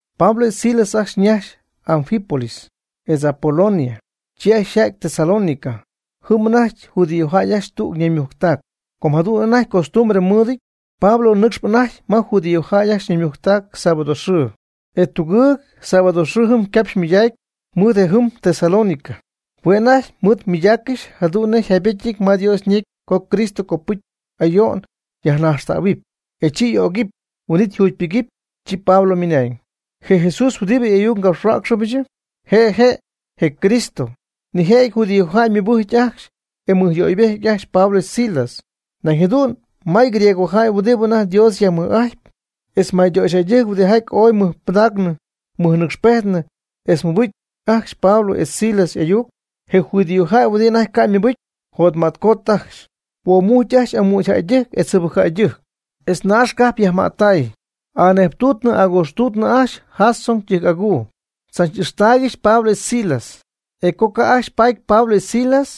Pablo etz Silas ajcxy ñajxy Anfípolis, etz Apolonia, chi ajcxy yja'ty Tesalónica. Jɨm anajty judíojäy ajcxy tüg ñaymujctac. Com jadu'n anajty costumbre mɨɨdɨty, Pablo nɨcxp anajty ma judíojäy ajcxy ñaymujctac sábado xɨɨ. E tugɨɨg sábado xɨɨ jɨm capxy mɨydacy mɨɨd je' jɨm Tesalónica. Hue' anajty mɨɨd mɨydaaccɨxy jadu'n nej jaybecyɨty ma Dios ñecy co Cristo copɨcy ayo'n yajnaxtähuɨp, e chi y'ögɨpy, huin'it yjugypɨgɨpy. Chi Pablo ymɨnañ: ―Je Jesús huɨdibɨ y'ayuc ngapxhuäcxɨbɨch, je' je' je Cristo. Nijëjɨty judíojäy ymɨbɨjc ajcxy e mɨjyöybejty ajcxy Pablo etz Silas. Nañ jadu'n may griegojäy huɨdi anajty Dios yajmɨj'ajtp, etz maytöxyjäydɨjc huɨdijaty oy ymɨjpɨdacnɨ ymɨjnɨcxpejt etz mɨbɨjc ajcxy Pablo etz Silas y'ayuc. Je judíojäy huɨdi anajty ca' ymɨbɨcy, yjotmätcoty ajcxy. Huomujcy ajcxy amügy jäydɨjc etz jɨbɨc jäydɨjc, etz naax cajp yajmättay, anejptuutɨ agojxtuutɨ ajcxy Jasón ytɨjc'aguu tzach'ixtaaygɨxy Pablo etz Silas. E co ca' ajcxy paty Pablo etz Silas,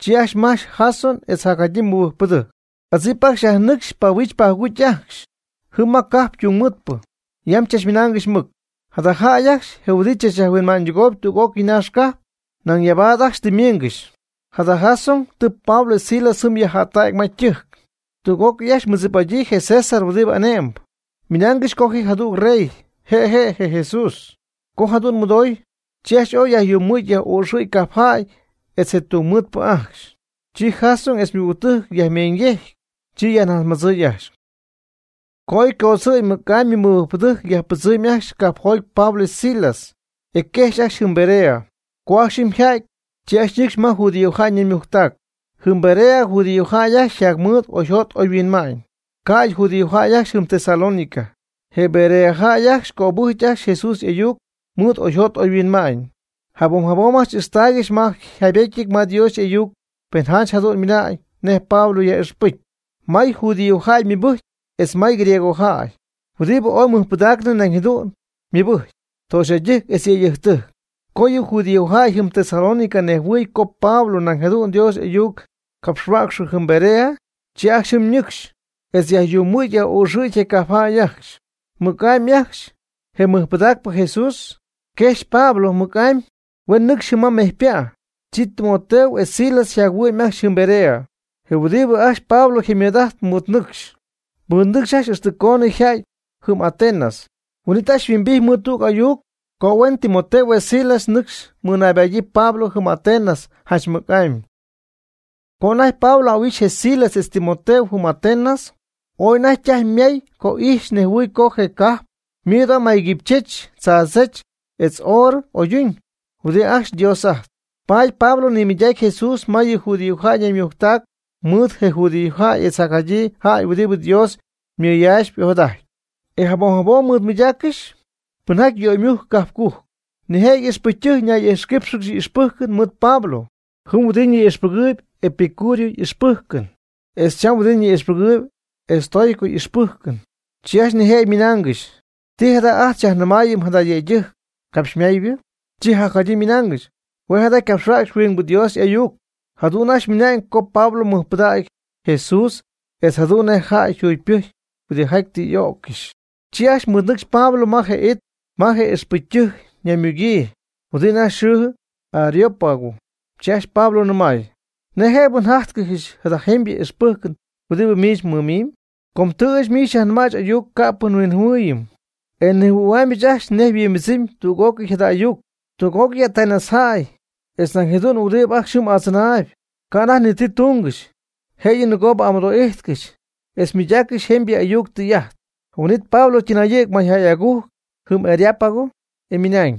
chi ajcxy majch Jasón etz jacjadyii mɨbɨjcpɨdɨjc. Adzip ajcxy yajnɨcxy pahuijch pajugujcy ajcxy jɨm ma cajp tungmɨɨdpɨ. Yam chachmɨnaangɨxy mɨc: ―Jada jäy ajcxy je' huɨdi tzachyajhuinma'ñydɨgooyb tüg'ócɨy naax cajp, nañ ɨyabaad ajcxy tɨ ymiingɨxy. Jada Jasón tɨ Pablo etz Silas jɨm yajjättägy ma ytɨjc, tüg'ócɨy ajcxy mɨɨddzip'adyii je César huɨdi ane'mb, ymɨnaangɨxy co ji jadüg rey, je' je' je Jesús. Co jadu'n mɨdoy, chi ajcxy ooy yajyumɨ̈gy yaj'oxɨ̈gy cajpjäy etz je tungmɨɨdpɨ ajcxy. Chi Jasón etz ymɨgügtɨjc yajmeeñyejcy, chi najtzmadzɨɨy ajcxy. Co oy ycodzɨ̈y mɨc'amy yɨ mɨbɨjcpɨdɨjc yajpɨdzɨmy ajcxy cajpjoty Pablo etz Silas, e quejxy ajcxy jɨm Berea. Co ajcxy jɨm yja'ty, chi ajcxy ñɨcxy ma judíojäy ñaymujctac. Jɨm Berea judíojäy ajcxy yjacmɨɨd oyjot oyhuinma'ñ, ca'ydɨ judíojäy ajcxy jɨm Tesalónica. Je Berea jäy ajcxy ycöbɨjc ajcxy Jesús y'ayuc ymɨɨd oyjot oyhuinma'ñ. Jabom jabom ixtaaygɨxy ma yjaybetyɨty ma Dios y'ayuc pen janch jadu'n ymɨna'ñ nej Pablo yaj'ixpɨcy. May judíojäy ymɨbɨjcy etz may griegojäy huɨdibɨ ooy ymɨjpɨdaacnɨ nañ jadu'n ymɨbɨjcy, töxyjäydɨjc etz yëydɨjctɨjc. Co yɨ judíojäy jɨm Tesalónica nejhuɨɨy co Pablo nañ jadu'n Dios y'ayuc capxhuäcxɨ jɨm Berea, chi ajcxy jɨm ñɨcxy, etz yajyumɨ̈gy yaj'oxɨ̈gy je cajp jäy ajcxy. Mɨc'amy ajcxy, je mɨjpɨdaacpɨ Jesús, yquejx Pablo mɨc'amy, huen nɨcxy jɨm ma mejypa'. Chi Timoteo etz Silas yjac-huɨ'my ajcxy jɨm Berea. Je huɨdibɨ ajcxy Pablo jaymɨɨd'ajt ymɨɨdnɨcxy, mɨɨd ñɨcxy ajcxy ixtɨ coonɨ yja'ty jɨm Atenas. Huin'it ajcxy yhuimbijty mɨɨd tüg ayuc co huen Timoteo etz Silas nɨcxy mɨnaybadyii Pablo jɨm Atenas janch mɨc'amy. Co anajty Pablo ahuixy je Silas etz Timoteo jɨm Atenas, ooy anajty ytajy ymay co ijxy nejhuɨɨy co je cajp mɨɨd ooy may quipychech, tzaadzech, etz oorɨ oyduñ huɨdi ajcxy dios'ajtpy. Paady Pablo nimɨydacy Jesús ma yɨ judíojäy ñaymujctac mɨɨd je judíojäy etz jacjadyii jäy huɨdi Dios mɨyaaxp ojadajtp. E jabom jabom mɨɨd mɨydaaccɨxy pɨnjaty y'oymujcp cajp cujc. Nijëjɨty ixpɨcytɨjc ñay'ijxquípxɨgɨxy y'ixpɨjcɨn mɨɨd Pablo. Jɨm huɨdibɨ ni'ixpɨgɨɨyb epicúreo ixpɨjcɨn, etz cham huɨdi ni'ixpɨgɨɨyb estoico ixpɨjcɨn. Chi ajcxy nijëjɨty ymɨnaangɨxy: ―¿Ti jada jada' ajt xyajnɨmaayɨm jada yëydɨjc capxymaaybɨ? Chi jadyii ymɨnaangɨxy: ―Hue' jada ycapxhuäcxyp huingbɨ dios y'ayuc. Jadu'n ajcxy ymɨnañ co Pablo nimɨydacy Jesús etz jadu'n nej jäy yjugypɨcy huɨdijaty tɨ y'öccɨxyp. Chi ajcxy mɨɨdnɨcxy Pablo ma je it ma je ixpɨcytɨjc ñaymugyii huɨdi anajty yxɨɨ Areópago, chi ajcxy Pablo nɨmay: ―¿Nej jëbɨ njájtcɨxɨch jada jemybɨ ixpɨjcɨn huɨdi miich mmɨmimb? Com tɨ ɨɨch miich xyajnɨmaaygɨch ayuc ca'pɨ yhuinjɨhuɨɨyñɨty, e nejhuɨ̈huaamyɨch ajcxy nej yhuimbɨdzɨmy tüg'ócɨy jada ayuc. Tüg'ócɨy Atenas jäy etz nañ jadu'n huɨdi ajcxy jɨm adzɨnaayb, ca' anajty ni ti tungɨxy, jëyɨ nɨgoobɨ amɨdo'ijtcɨxy etz mɨydaaccɨxy jemybɨ ayuc tɨy'ajt. Huin'it Pablo ytɨnayɨ̈gy mayjäy agujc jɨm Areópago, e ymɨnañ: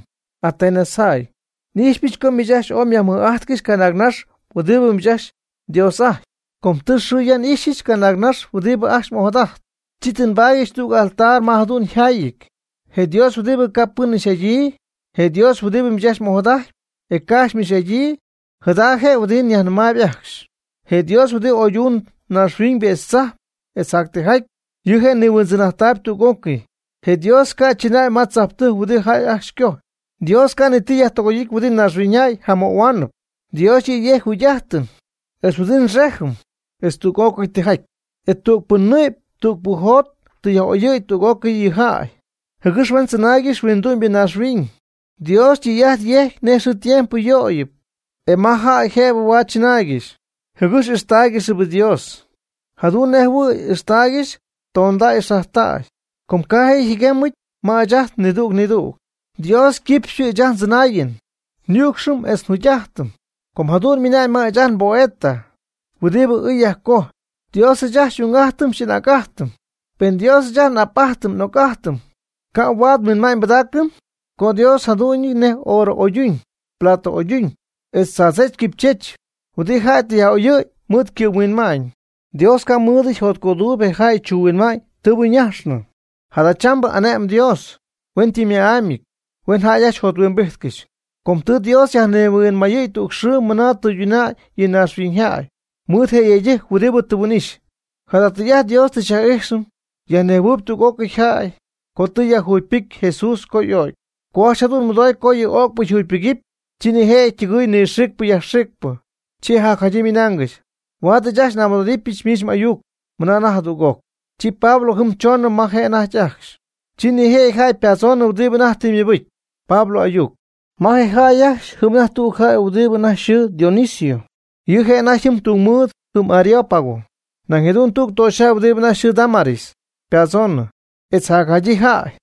―Atenas jäy, n'ijxypɨch co miich ajcxy ooy myajmɨj'ajtcɨxy canaagnax huɨdibɨ miich ajcxy mdios'ajtpy. Com tɨ xɨɨ ya n'ixyɨch canaagnax huɨdi ajcxy m'ojadajtpy, chi tɨ nbaatyɨch tüg altar ma jadu'n yjaayɨty: “Je Dios huɨdi ca' pɨn ixy'adyii.” Je Dios huɨdi miich ajcxy m'ojadajtyp, e ca' ajcxy m'ixy'adyii, jada je' huɨdi nyajnɨmaayb ajcxy. Je Dios huɨdi oyduñ naaxhuiñybɨ etz tzajp etz jac tijaty, yɨ' je' nihuindzɨn'ajttayb tüg'ócɨy. Je Dios ca' chɨnäy ma tzajptɨjc huɨdi jäy ajcxy cojpy. Dios ca' ni ti yajtɨgoy'ity huɨdi naaxhuiñyjäy jamöhuaanɨp. Dios yɨ' yejcp jugy'ajtɨn etz huɨdibɨ nxejɨm, etz tüg'ócɨy tijaty. E tügpɨ nɨ'py tügpɨ jot tɨ yaj'oyɨ̈y tüg'ócɨy yɨ jäy, jɨgɨx huen tzɨnaaygɨxy huindu'my naaxhuiñ. Dios tɨy'ajt yejcp nej xɨɨ tiempo yöyɨpy, e ma jäy jëbɨ huaad chɨnaaygɨxy, jɨgɨx ixtáaygɨxɨpy Dios, jadu'n nej jɨhuɨ̈y ixtaaygɨxy tondäy xajtäy, com ca' je' jɨguemɨty ma ɨɨch ajt nidüg nidüg. Dios ycɨxpɨ ɨɨch ajt ndzɨnaayɨm nyücxɨm etz nji'ajtɨm, com jadu'n mɨnañ miich ajcxy mboeta, huɨdibɨ ɨɨy yajcojp: “Dios ɨɨch ajt xy'ung'ajtɨm xy'anäg'ajtɨm.” Pen Dios ɨɨch ajt xy'ap'ajt xy'oc'ájtɨm ca' huaad nhuinma'ñ nbɨdaacɨm co Dios yjadu'ñɨty nej oorɨ oyduñ, plata oyduñ, etz tzaadzech quipychech huɨdi jäy tɨ yaj'oyɨ̈y mɨɨd ycɨ'mhuinma'ñ. Dios ca' mɨɨdɨty jotcöduuyb je jäy chuuhuinma'ñ tɨɨbɨ ñajxnɨ. Jadachambɨ ane'mb Dios hueñytɨmma'amyɨty huen jäy ajcxy jothuimbijtcɨxy. Com tɨ Dios yajnihuinmayɨ̈y tüg xɨɨ mɨna tɨyduna'ñ yɨ naaxhuiñybɨ jäy mɨɨd je yëydɨjc huɨdibɨ tɨ huin'ixy, jada tɨy'ajt Dios tɨ yaj'ixy yajnejhuɨ̈y tüg'ócɨy jäy co tɨ yajjugypɨcy Jesús co y'o'cy. Co ajcxy jadu'n mɨdoy co yɨ öcpɨ yjugypɨgɨpy, chi nijëjɨty ytɨgɨy nɨxiicpɨ yajxiicpɨ. Chi jacjadyii ymɨnaangɨxy: ―Huaad ɨɨch ajcxy n'amɨdo'idɨpyɨch miich m'ayuc mɨna anajty jadüg'oc. Chi Pablo jɨm choonɨ ma je' anajty ajcxy. Chi nijëjɨty jäy ypadzoonɨ huɨdi anajty tɨ mɨbɨcy Pablo y'ayuc. Ma je' ajcxy jɨm anajty tüg jäy huɨdibɨ anajty yxɨɨ Dionisio, yɨ' je' anajty tungmɨɨd jɨm Areópago. Nañ jadu'n tüg töxyjäy huɨdi anajty yxɨɨ Dámaris ypadzoonɨ, etz jacjadyii jäy.